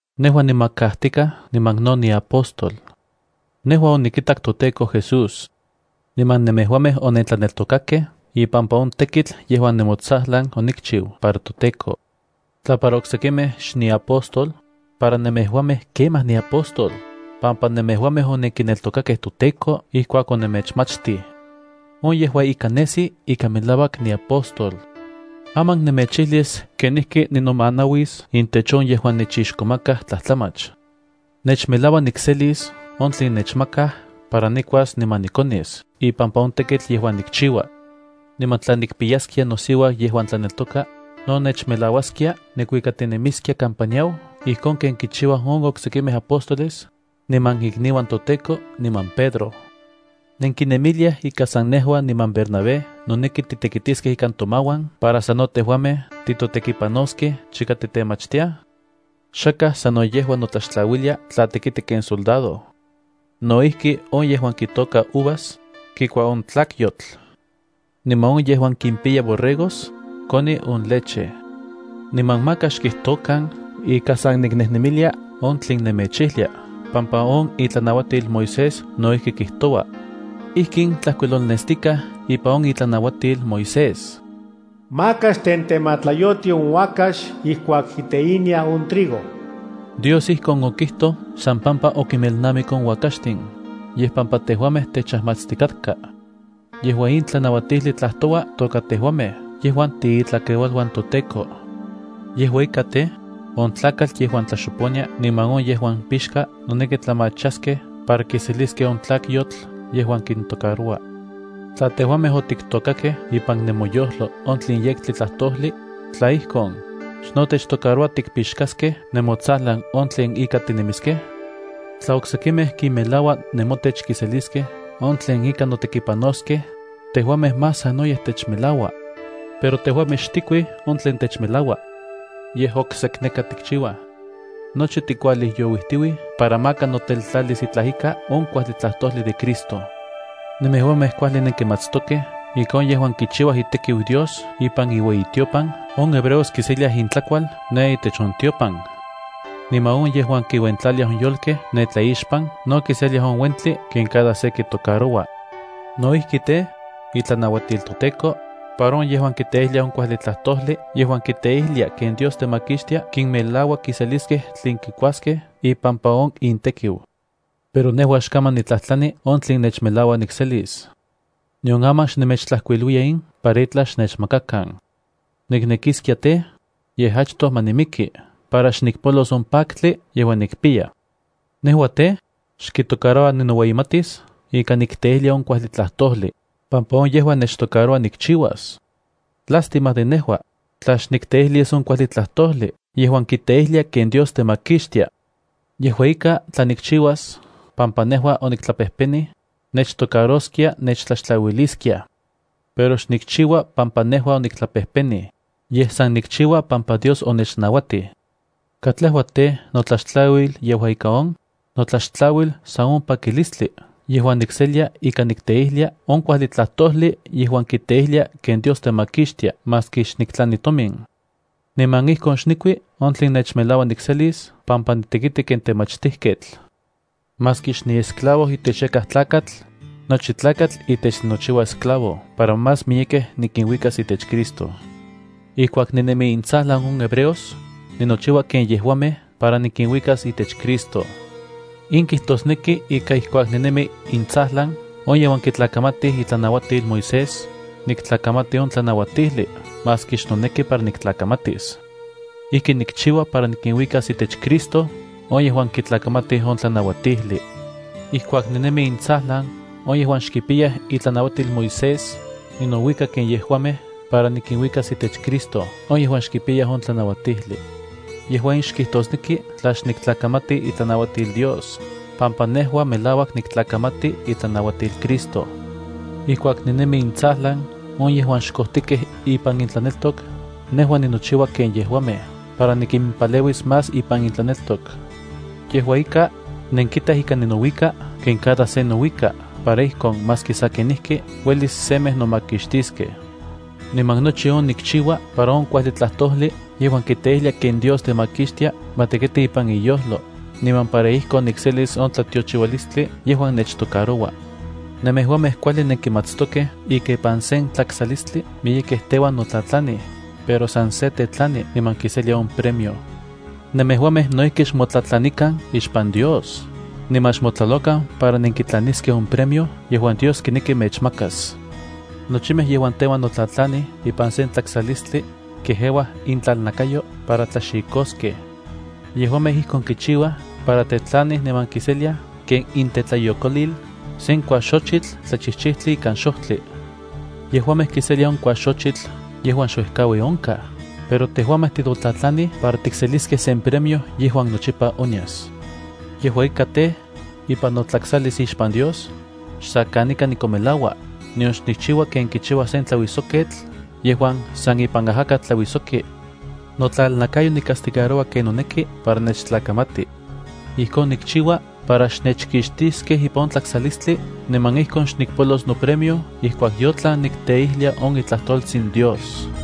Nejua nimakajtikaj niman no niapóstol. Nejua onikitak toTEKO Jesús. Niman nemejuamej onentlaneltokakej ipampa on tekitl yejuan nemotsajlan onikchiu para toTEKO. Tla para oksekimej xniapóstol, para nemejuamej kemaj niapóstol, pampa nemejuamej onenkineltokakej toTEKO ijkuak onemechmachtij. On yejua ika nesi ika melauak niapóstol. Aman nemechijlis kenijki ninomanauis intech on yejuan nechixkomakaj tlajtlamach. Nechmelaua nikselis on tlen nechmakaj para nikuas niman nikonis ipampa on tekitl yejuan nikchiua. Niman tla nikpiyaskia nosiuau yejuan tlaneltoka, no nechmelauaskia nikuikatinemiskia kampa niau ijkon ken kichiuaj on oksekimej apóstoles, niman ikniuan toTEKO, niman Pedro. ¿Nenkinemiliaj ika san nejua niman Bernabé noneki titekitiskej ikan tomauan para sano tejuamej titotekipanoskej chika titemachtiaj? Xakaj sano yejua notlaxtlauilia tla tekiti ken soldado. No ijki, on yejuan kitôka uvas kikua on tlakyotl. Niman on yejuan kimpiyaj borregos ueli koni on leche. Niman maka xkijtokan ika san niknejnemilia on tlen nemechijlia pampa on itlanauatil Moisés no ijki kijtoua. Ijkin tlajkuilolnestikaj ipan on itlanauatil Moisés: “Maka xtentematlayoti on uakax ijkuak kiteinia on trigo.” Dios ijkon okijtoj xsan pampa okinmelnamik on uakaxtin, yej pampa tejuamej techajmatstikatka. Yejua in tlanauatijli tlajtoua toka tejuamej yejuan tiitlakeualuan toTEKO. Yejua ika tej, on tlakatl yejuan tlaxoponia niman on yejuan pixka noneki tlamachaskej para kiseliskej on tlakyotl yejuan kintocaroua. Tla tejuamej otiktôkakej ipan nemoyojlo on tlen yektli tlajtojli, tla ijkon, ¿xno techtocaroua tikpixkaskej nemotsajlan on tlen ika tinemiskej? Tla oksekimej kinmelaua nemotech kiseliskej on tlen ika notekipanoskej, tejuamej más sanoyej techmelaua. Pero tejuamej xtikuij on tlen techmelaua. Yej oksekneka tikchiuaj. Nochi tikualijyouijtiuij para maka noteltlalis itlaj ika on kuajli tlajtojli de Cristo. Nemejuamej kuajli nenkimatstokej ika on yejuan kichiuaj itekiu Dios ipan iueyitiopan on hebreos kiseliaj intlakual ne itech on tiopan. Niman on yejuan kinuentlaliaj on yolkej ne tlaixpan no kiseliaj on uentli ken cada se kitocaroua. No ijki tej, otlanauatij toTEKO, para on yejuan kiteijliaj on kuajli tlajtojli yejuan kiteijlia ken Dios temakixtia kinmelaua kiseliskej tlen kikuaskej ipampa on intekiu. Pero nejua xkaman nitlajtlani on tlen nechmelaua nikselis. Nion aman xnemechtlajkuiluiya in para itlaj xnechmakakan. ¡Niknekiskia tej, yej achtoj ma nimiki para xnikpolos on paktli yejuan nikpiya! Nejua tej, xkitocaroua ninoueyimatis ika nikteijlia on kuajli tlajtojli, pampa on yejua nechtocaroua nikchiuas. ¡Lástima de nejua, tla xnikteijlis on kuajli tlajtojli yejuan kiteijlia ken Dios temakixtia! Yejua ika, tla nikchiuas pampa nejua oniktlapejpenij, nechtocaroskia nechtlaxtlauiliskiaj. Pero xnikchiua pampa nejua oniktlapejpenij. Yej san nikchiua pampa Dios onechnauatij. ¿Katlejua tej, notlaxtlauil yejua ika on? Notlaxtlauil san on pakilistli yejuan nikselia ika nikteijlia on kuajli tlajtojli yejuan kiteijlia ken Dios temakixtia maski xniktlani tomin. Niman ijkon xnikui on tlen nechmelaua nikselis pampa nitekiti ken temachtijketl. Maski xniesclavo itech yakaj tlakatl, nochi tlakatl itech ninochiua esclavo para más miyekej nikinuikas itech Cristo. Ijkuak ninemi intsajlan on hebreos, ninochiua ken yejuamej para nikinuikas itech Cristo. In kijtosneki ika ijkuak ninemi intsajlan on yejuan kitlakamatij itlanauatil Moisés, niktlakamati on tlanauatijli maski xnoneki para niktlakamatis. Ijkin nikchiua para nikinuikas itech Cristo on yejuan kitlakamatij on tlanauatijli. Ijkuak ninemi intsajlan on yejuan xkipiyaj itlanauatil Moisés, ninouika ken yejuamej para nikinuikas itech Cristo on yejuan xkipiyaj on tlanauatijli. Yejua in xkijtosneki tla xniktlakamati itlanauatil Dios, pampa nejua melauak niktlakamati itlanauatil Cristo. Ijkuak ninemi intsajlan on yejuan xkojtikej ipan intlaneltok, nejua ninochiua ken yejuamej para nikimpaleuis más ipan intlaneltok. Yejua ika, nenkitaj ika ninouika ken cada se nouika para ijkon maski sa kenijki uelis semej nomakixtiskej. Niman nochi on nikchiua para on kuajli tlajtojli yejuan kiteijlia ken Dios temakixtia ma tekiti ipan inyojlo, niman para ijkon nikselis on tlatiochiualistli yejuan nechtocaroua. Nemejuamej kuajli nenkimatstokej ika ipan sen tlaksalistli miyekej teuan notlatlanij, pero san se tetlani niman kiselia on premio. Nemejuamej no ijki xmotlatlanikan ixpan Dios, niman xmotlalokan para nenkitlaniskej on premio yejuan Dios kineki mechmakas. Nochimej yejuan teuan notlatlanij ipan se tlaksalistli, kejeuaj intlalnakayo para tlaxikoskej. Yejuamej ijkon kichiuaj para tetlanij niman kiseliaj ken intetlayokolil sen kuaxochitl tlachijchijtli ikan xojtli. Yejuamej kiseliaj on kuaxochitl yejuan xuejkaui onkaj, pero tejuamej titotlatlanij para tikseliskej sen premio yejuan nochipa onyas. Yejua ika tej, ipan notlaksalis ixpan Dios, xsa kanika nikonmelaua, nion xnikchiua ken kichiua sen tlauijsoketl yejuan san ipan ajakatl tlauijsoki. Notlalnakayo nicastigaroua ken noneki para nechtlakamati. Ijkon nikchiua para xnechkixtiskej ipan on tlaksalistli niman ijkon xnikpolos nopremio ijkuak yotlan nikteijlia on itlajtoltsin Dios.